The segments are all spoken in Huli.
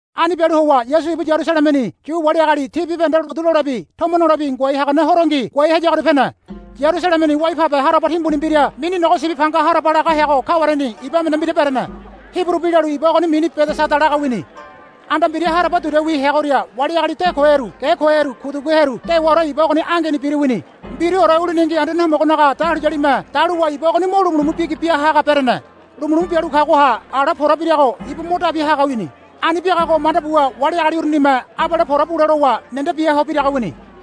Ani bialu howa Yasu ibu Yarusalemeni Yu wali agali ti bibahende lotu lolebi tomo nolebi ngoai hagane horongi ngoai hayagoria pene. Yarusalemeni wai pabe haraba timbuni mbira mini Nogo Sibi Panga laga heago kawareni iba emene mbira berene. Hiburu bi lalu iba ogoni mini Bedeseda laga wini. Anda mbira haraba duria wi heagoria wali agali de koheru ge koheru kuduguheru dewaore iba ogoni angeni biru wini. [Mbiruore uliningi Anduane Homogonaga dahuliyalime daluwa iba ogoni mo lumulumu bigi bia haga berene. Lumulumu bialu kagoha ala pora birago ibu mo dabi haga wini. Ani biagago manda buwa wali agali urunime abale pora bule lowa nende bia ho biraga biaga wini.]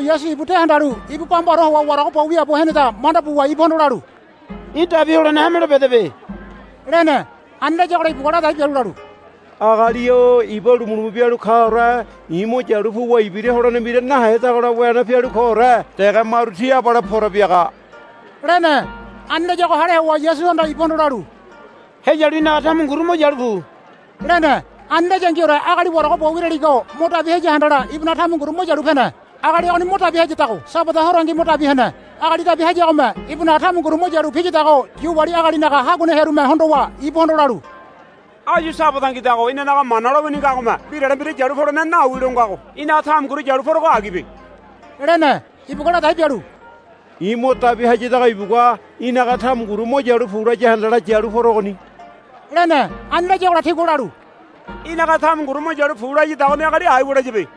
Yasu ibu de handalu ibu bambaore howa warago bo wiaabo heneda manda buwa ibuhondo lalu, Í̠ dabi holene hamelo bedebe, lene. Ani layagola ibugua ladai bialu lalu, Agali-o iba lumulumu bialu kaore i̱ mo yalu puwa ibira holene mbira nahedagola wene pialu koore dege maru ti abale pora biaga, lene. Ani layago hale howa Yasuhanda ibuhondo lalu, Heyalu í̠naga tamunguru mo yalu pu, lene. Ani layangiore agali warago bo wiraligo mo dabi haya handala ibunaga tamunguru mo yalu pene. Agali ogoni mo dabi hayadago Sabada horongi mo dabi hene. Agali dabi hayagome ibunaga tamunguru mo yalu piyadago Yu wali agalinaga haguane hearume hondowa ibuhondo lalu, Áyu Sabadangidago inanaga Mana lowini ngagome mbirale mbira yalu polene nawi longago í̠naga tamunguru yalu porego agibe, lene. Ibugua ladai bialu, I̱ mo dabi hayadago ibugua í̠naga tamunguru mo yalu pu laya handala yalu porogoni, lene. Ani layagola tigua lalu, Í̠naga tamunguru mo yalu pu layadagoni agali aiwa layabe,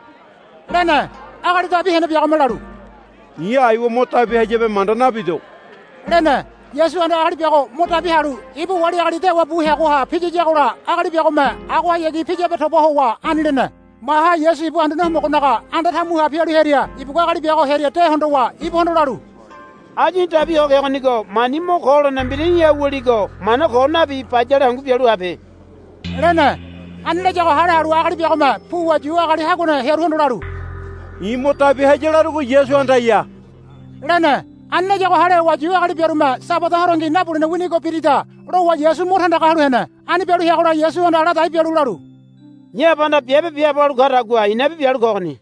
lene. Agali dabi hene biagome lalu, I̱ aiwa mo dabi hayabe manda nabido, lene. Yasuhanda agali biago mo dabi halu ibu wali agali dewa bu heagoha piyiyagola agali biagome agohayagi piyabe toba howa ani lene. Maha Yasu ibu Anduane Homogonaga anda tamuha pialu hearia ibugua agali biago hearia de hondowa ibuhondo lalu, Áyu í̠ dabi ho kegonigo mani mo ko holene mbira í̠ha wuligo mana ko nabi bayale hangu bialu habe, lene. Ani layago hale halu agali biagome puwa Yu agali haguane hearuhondo lalu, I̱ mo dabi haya larugo Yasuhandaya, lene. Ani layago hale howa Yu agali biarume, Sabada horongi nabulene winigo birida, lowa Yasu mo tandaga halu hene. Ani bialu heagola Yasuhanda ladai bialu lalu, I̱ Abahanda biabe biaabo halu kadagua i̱nabi bialu kogoni,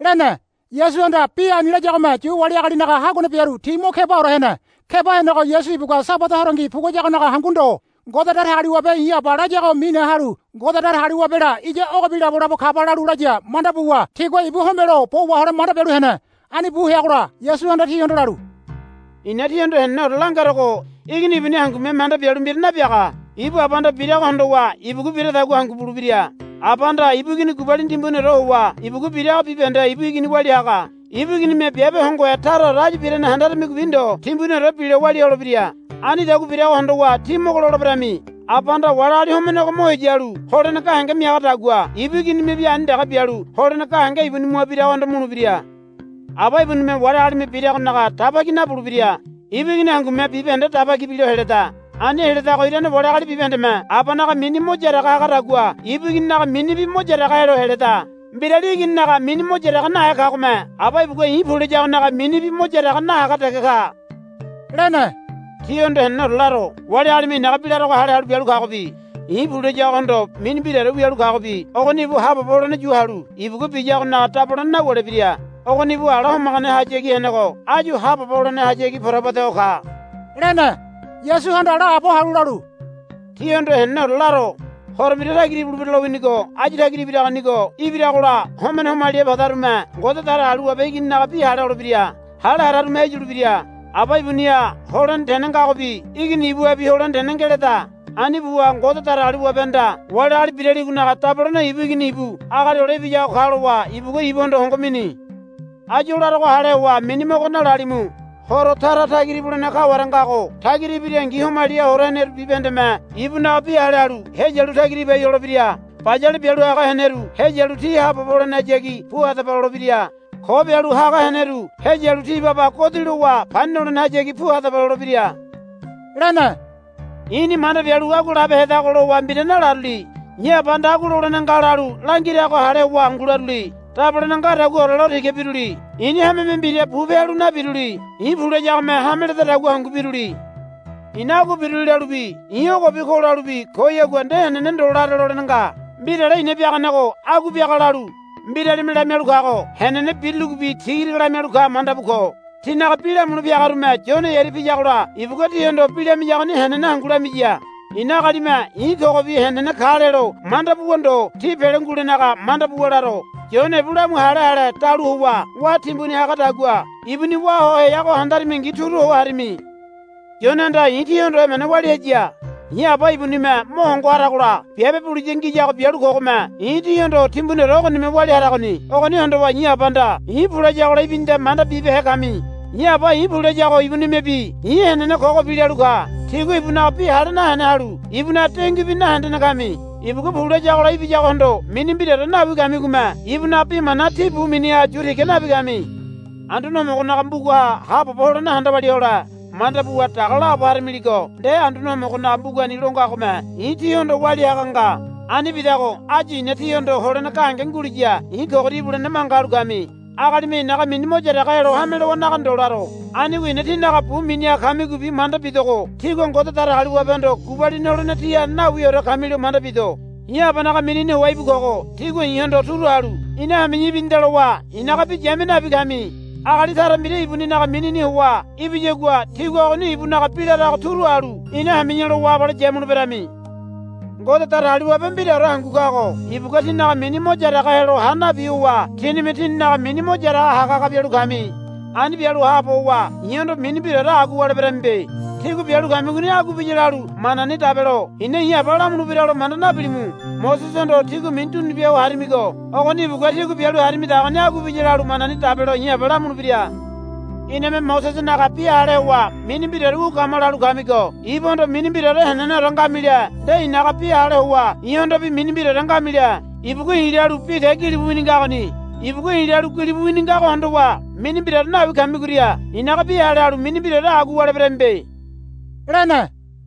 lene. Yasuhanda bi ani layagome Yu wali agalinaga haguane biaru ti mo kebaore hene. Keba henego Yasu ibugua Sabada horongi puguayagonaga hangu ndo. Ngode Datagaliwabe i̱ Aba layago mine halu Ngode Datagaliwabela iya ogobi labolabo kaba lalu laya manda buwa tigua ibu homelo bo wahole manda bialu hene. Ani bu heagola Yasuhanda tihondo lalu, I̱na tíhondo heneneore langerogo. Igini ibuni hangume manda bialu mbira nabiaga. Ibu Abahanda birago hondowa ibugua biradagua hangu bulebira. Abahanda ibu Igini gubalini timbuniore howa ibugua birago bibahende ibu Igini walia haga. Ibu Iginime biabe hongohe taraore áyu birane handarimigobi ndo timbuniorebi bilo walia holebira. Anidagua birago hondowa tí mogo loleberami. Abahanda wali agali homenego mo heya halu holene gahenge miagadagua ibu Iginimebi ani dege bialu holene gahenge ibuni mua biragohondo mulebira. Aba ibunime wali agalime biragonaga daba ki nabulebira. Ibu Igini hangume bibahende daba ki bilo heleda. Ani heledago irane wali agali bibahendeme Abanaga mini mo yaraga hagadagua ibu Igininaga minibi mo yaraga helo heleda. Mbirali Igininaga mini mo yaraga nahe kagome Aba ibugua i̱ pu layagonaga minibi mo yaraga nahaga dege ka, lene. Tíhondo heneneore laro. Wali agalime i̱naga bi larogo hale halu bialu kagobi i̱ pu layagohondo mini mbiraore wialu kagobi ogoni ibu haabobo holene yu halu ibugua biyagonaga dabolene nawulebira. Ogoni ibu ala homaganehayagi henego áyu haabobo holenehayagi porabu ede ho ka, lene. Yasuhanda laabo halu lalu, Tíhondo heneneore laro. Horo mbira tagira ibulebira lowinigo áyu tagira ibiragonigo ibiragola homene homaliha padarume Ngode Datagaliwabe Igininaga bi hale holebira. Hale hararume heyulebira. Aba ibuniha holene tene ngagobi Igini ibuhabi holene tene ngeleda. Ani buwa Ngode Datagaliwabehanda wali agali biraligonaga dabolene ibu Igini ibu Agali Hole Ibiyago ka lowa ibugua ibuhondo hongo mini. Áyu o larogo hale howa mini mogo nalalimu. Horo tara tagira ibulene kaware ngago tagira ibirangi homaliha hora heneru bibahendeme ibunaga bi hale halu heyalu tagira ibai holebira. Bayale bialu haga heneru heyalu ti haabobo holenehayagi pu hadaba lolebira. Ko bialu haga heneru heyalu ti baba godi lowa pani nolenehayagi pu hadaba lolebira, lene. I̱ni manda bialu agua labehedago lowa mbira nalaruli. I̱ Abahanda, Agua lolene nga, lalu langirago hale howa hangu laruli. Dabolene ngadaguaore lo tiga biruli. I̱ni hameme mbira bupe halu nabiruli. I̱ pu layagome hame ledadagua hangu biruli. I̱na agua biruli lalubi i̱ ogobi ko lalubi koyagua nde henene ndo lare lolene nga. Mbirale i̱na biaganego agua biaga lalu mbiralime lamialu kago henene biruligobi tiga tiga lamialu ka manda bu ko. Tínaga bi lamule piagarume Yone hearia piyagola ibugua tihondo bi lamiyagoni henene hangu lamiya. I̱na agalime i̱ kogobi henene ka lelo manda buwa ndo tí pele ngulenaga manda buwa laro. Yone ibu lamu hale ale dalu howa wá timbuni hagadagua ibuni wá ho heago handarimingi turu ho harimi. Yonehanda i̱ tíhondo emene walia haya. I̱ Aba ibunime mo hongo haragola biabe buliya ngiyago bialu kogome i̱ tíhondo timbuniore ogonime walia haragoni. Ogoni hondowa i̱ Abahanda i̱ pu layagola ibinida manda bibehe kami. I̱ Aba i̱ pu layago ibunime bi i̱ henene kogobi lalu ka. Tígua ibunaga bi hale nahene halu ibunaga denguibi nahendene kami. Ibugua pu layagola ibiyagohondo mini mbiraore nawi kamigome ibunaga bi mana tí bu miniha yu tiga nabi kami. Anduane Homogonaga mbugaha haabobo holene handa walia hole manda buwa daga laabo haramiligo nde Anduane Homogonaga mbugani lo ngagome i̱ tíhondo walia haga nga. Ani bidago áyu i̱na tíhondo holene gahenge nguliya i̱ kogoria ibulene manga halu kami. Agalime i̱naga mini mo yaraga helo hame lowanaga ndo laro. Anigo i̱na tínaga bu miniha kamigobi manda bidogo tígua Ngode Datagaliwabehondo gubalini holene tíha nawiore kamilo manda bido. I̱ Abanaga minini howa íbu kogo tígua i̱hondo turu halu ina hami̱ya ibinida lowa i̱naga bi yamia nabi kami. Agali tara mbira ibuninaga minini howa ibiyagua tígua ogoni ibunaga bi larago turu halu ina hami̱ya lowa abale yamuleberami. Ngode Datagaliwabe mbiraore hangu kago ibugua tínaga mini mo yaraga helo ha nabi howa tínime tíninaga mini mo yaraga haga haga bialu kami. Ani bialu haabo howa i̱hondo mini mbiraore agua wuleberamibe. Tígua bialu kamigoni agua biya lalu manani dabelo i̱na i̱ Aba lamulebiralo manda nabilimu. Mosesehondo tígua mini dunubia ho harimigo ogoni ibugua tígua bialu harimidagoni agua biya lalu manani dabelo i̱ Aba lamulebira. Iname Mosesenaga bi hale howa mini mbiraore wu kama, lalu kamigo ibuhondo mini mbiraore heneneore ngamile nde i̱naga bi hale howa i̱hondobi mini mbiraore ngamile. Ibugua i̱ lalu bi te gilibu wini ngagoni. Ibugua i̱ lalu gilibu wini ngago hondowa mini mbiraore nawi kamigoria i̱naga bi hale halu mini mbiraore agua wuleberamibe, lene.